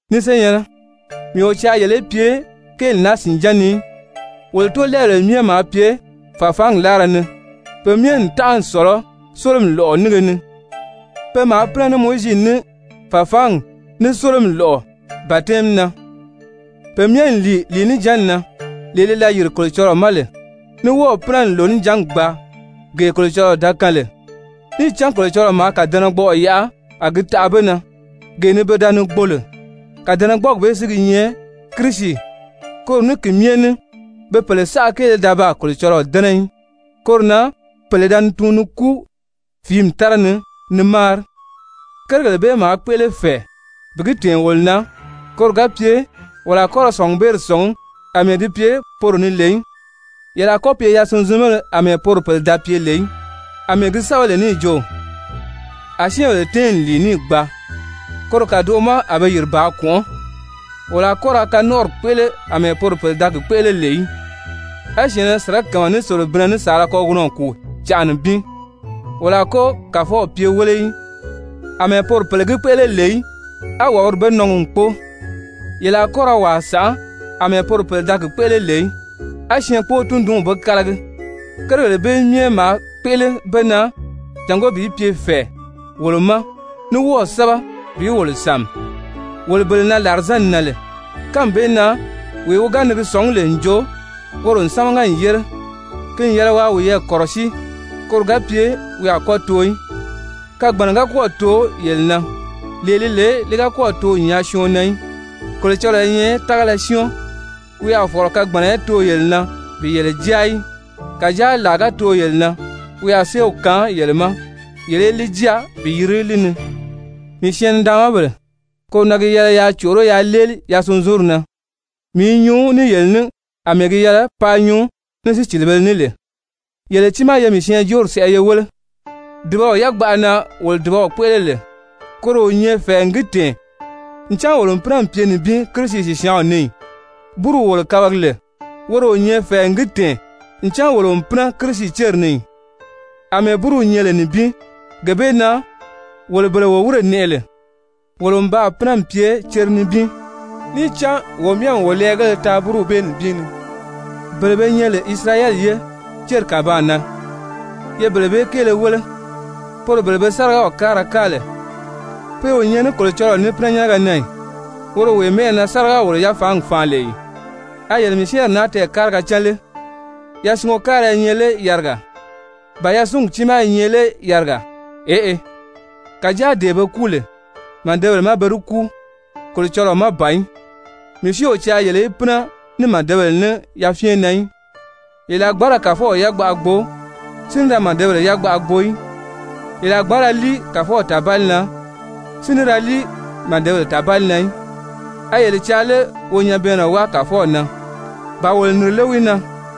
Ni senyɛ̀nnɛ, mii o caa yele í pye kéeli naa sìnján ni í. Wolo tóolɛɛbèle myɛ maa pye fàfaangi láara ni, pe myɛ n tánʔa n sɔ̀lɔ Sólomi lɔ̀ʔɔ nínge ni. Pe maa pínɛ ní Mowizi ní fàfaangi ní Sólomi lɔ̀ʔɔ batɛmi na. Pe myɛ n lìi lìinijanni na, lee li da yìri Kolocɔlɔɔ ma lè, ní wɔ́ɔ̀ pínɛ n lònijangi gbaa, gee Kolocɔlɔɔ da kaan lè, níì cán Kolocɔlɔɔ maa kàdɛnɛgbɔʔɔ yaʔa a gi taʔa be na, gee ni pe da ni gbo lè. Kàdɛnɛgbɔɔgi bee si gi nyɛ Kirisi. Koro ní ki myɛ ní be pèle saʔa kéele da baa Kolocɔlɔɔ dɛ́nɛ í, koro na pèle da ni tuun ni kúu fìími tára ni ni máari. Kérigèle bee maa kpéʔele fɛ̀ɛ bi gi tɛ̀ɛn wolo na koro ga pye wolo a kɔ́ ra sɔ̀ngubeeri sɔ̀ngí àmɛɛ di pye poro ni lè í. Yele a kɔ́ pye yasunzunbéle àmɛɛ poro pèle da pye lè í, àmɛɛ gi sɛ́bɛ lè níì jo: «A syɛ́ɛnbèle tɛ́ɛn n lìi, níì gbaa. Koro kàdoʔo ma a be yìri bàā kɔ̀nʔɔ́.» Wolo a kɔ́ ra kanɔnʔɔri kpéʔele àmɛɛ poro pèle da gi kpéʔele lè í, a syɛ̀ɛnnɛ sirakama ní selebinnɛ ní saala kagunɔ kùu canʔa nibin ni. Wolo a kɔ́ Kàfɔw pye wéle í àmɛɛ poro pèle gi kpéʔele lè í, á wàbiri be nɔngi n kpóo. Yele a kɔ́ ra wàa sànʔá àmɛɛ poro pèle da gi kpéʔele lè í, a syɛɛnkpoo-tundunw be kálagi. Kérigèle bee myɛ maa kpéʔele be na jàngó bi pye fɛ̀ɛ wolo ma ní wɔ́ɔ̀ sɛ́bɛ bi wolo sàmi, wolo bele na làrizanni nan lè. Kánmi bee na wee wi ga ni gi sɔ̀ngí lè n jo woro n sámaga n yére, ki n yɛlɛ waa wiyɛɛ kɔ̀rɔsíi, koro ga pye wi a kɔ́ too í. Kagbanna ga kɔ́ɔ̀ too yele na, lee li lè li ga kɔ́ɔ̀ too n nyaa syɔɔn na í. Kolocɔlɔɔ i nyɛ tágala syɔ́ɔn, wi a fɔ̀lɔ kagbanna í too yele na bi yele jáa í. Kàjáa làa ga too yele na, wi a séew kaan yele ma yele í li jáa bi yiri li ni. Mii syɛɛn-nidaanmabèle, koro na gi yɛlɛ yaa còʔoró yaa léeli yasunzunri na. Mii i nyuu ní yele ní àmɛɛ gi yɛlɛ paa nyuu ní sícilibēle ní lè. Yele tiimaa ye mii syɛɛnjóori sɛʔɛ ye wéle. Dùbaw yagbaʔa na wolo dùbaw kpéʔele lè, koro o nyɛ fɛ̀ɛ n gi tɛ̀ɛn ncan wolo n pínɛ n pye nibin Kirisi sìsyaanw ni ì? Búruw wolo kabagi lè, woro o nyɛ fɛ̀ɛ n gi tɛ̀ɛn ncan wolo n pínɛ Kirisi céri ni ì? Amɛɛ búruw nyɛ lè nibin, gee bee na wolo bele wo wírè nɛʔɛ lè, wolo n baa pínɛ n pye cere nibin. Níì cán wo myɛ n wo lɛɛgéle taa búruw bee nibin ni. Bele be nyɛ lè Isirayɛli ye, céri kàbaan na, ye bele bee kéele wéle, poro bele be sárigaw káara káa lè, pe o nyɛ ní Kolocɔlɔɔ ní pínɛnyɛnnɛgɛ na ì, woro wee mɛ́ʔɛ na be sáriga-wòlo-yafaangi faan lè ì? A yele mii syɛ́ɛnri naa tɛɛkáriga cán lé? Yasungo káara i nyɛ lé yarigaa? Ba yasungi tiimaa i nyɛ lé yarigaa? Eʔe. Kàjáa dee be kúu lè, màdebèle má pe di kúu, Kolocɔlɔɔ má ban í. Mii si o caa yele í pínɛ ní màdebèle ní yafyɛn na í. Yele a gbǎn ra Kàfɔw yagbaʔa gbo si ní ra màdebèle yagbaʔa gbo í. Yele a gbǎn ra líi Kàfɔw tàbali na, si ní ra líi màdebèle tàbali na í. A yele caa lé wo nyabɛɛnnɛ wáa Kàfɔw na? Ba wolo nìri lé wi na?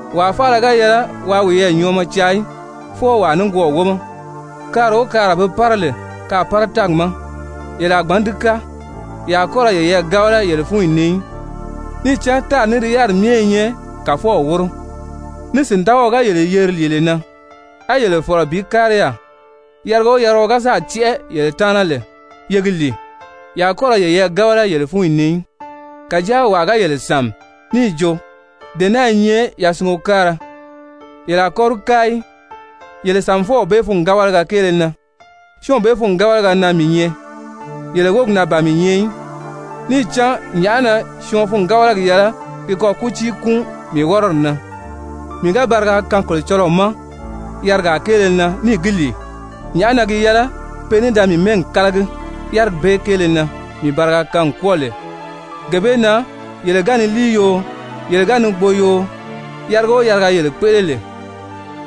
Wàa faala ga yɛlɛ waa wiyɛɛ nyɔɔmɔ caa í, fwɔɔ wàa nikwɔɔ wómɔ. Kaara o kaara be pára lè kaàpára-tɛ́ɛgi ma, yele a gbǎn di káa, ye a kɔ́ ra yeyɛɛ gábala yele fúnyi ni í. Níì cán «tári ní di yáriri myɛ i nyɛ Kàfɔw wóro.» Ní sìndagaɔ ga yele yeri lìile na, á yele fɔ̀lɔ bi kári yaà, yariga o yariga wi ga sáà tɛ́ʔɛ yele taana lè, ye gi lìi, ye a kɔ́ ra yeyɛɛ gábala yele fúnyi ni í. Kàjáa wàa ga yele sàmi níì jo, «dee naa i nyɛ yasungo káara,» yele a kɔ́ di káa í yele sàmifɔw bee fûngabalaga kéele na. Syɔ́ɔnw bee fûngabalaga na mii nyɛ, yele wógi na ban mii nyɛ í. Níì cán nyàʔá na syɔɔn fûngabalagi yɛlɛ gi kɔ kútii kúun mii wɔ́rɔdi na? Mii ga bariga kaan Kolocɔlɔɔ ma yarigaa kéele na, níì gi lìi, nyàʔá na gi yɛlɛ pe ní da mii mɛ́ɛgi kálagi yárigi bee kéele na mii bariga kaan n kwɔ́ɔ lè? Gee bee na yele ga ni líi yoo, yele ga ni gbo yoo, yariga o yariga yele kpéʔele lè,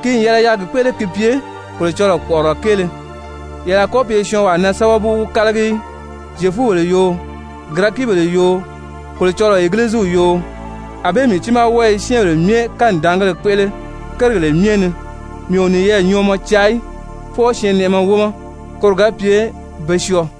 ki n yɛlɛ yaa gi kpéʔele ki pye Kolocɔlɔɔ kpɔ̀ʔɔrɔlɔ kéele. Yele a kɔ́ pye syɔɔnwaa na sábabu wí kálagi í, Zyefubèle yoo, Girɛkibèle yoo, Kolocɔlɔɔ Egiliziw yoo. Anbée mii tiimaa wɔ́ɔ i syɛ́ɛnbèle myɛ kanidaangéle kpéʔele kérigèle myɛ ni. Mii o niyɛɛ nyɔɔmɔ caa í, fwɔɔ syɛɛnnɛʔɛmɛ wómɔ, koro ga pye be syɔɔ.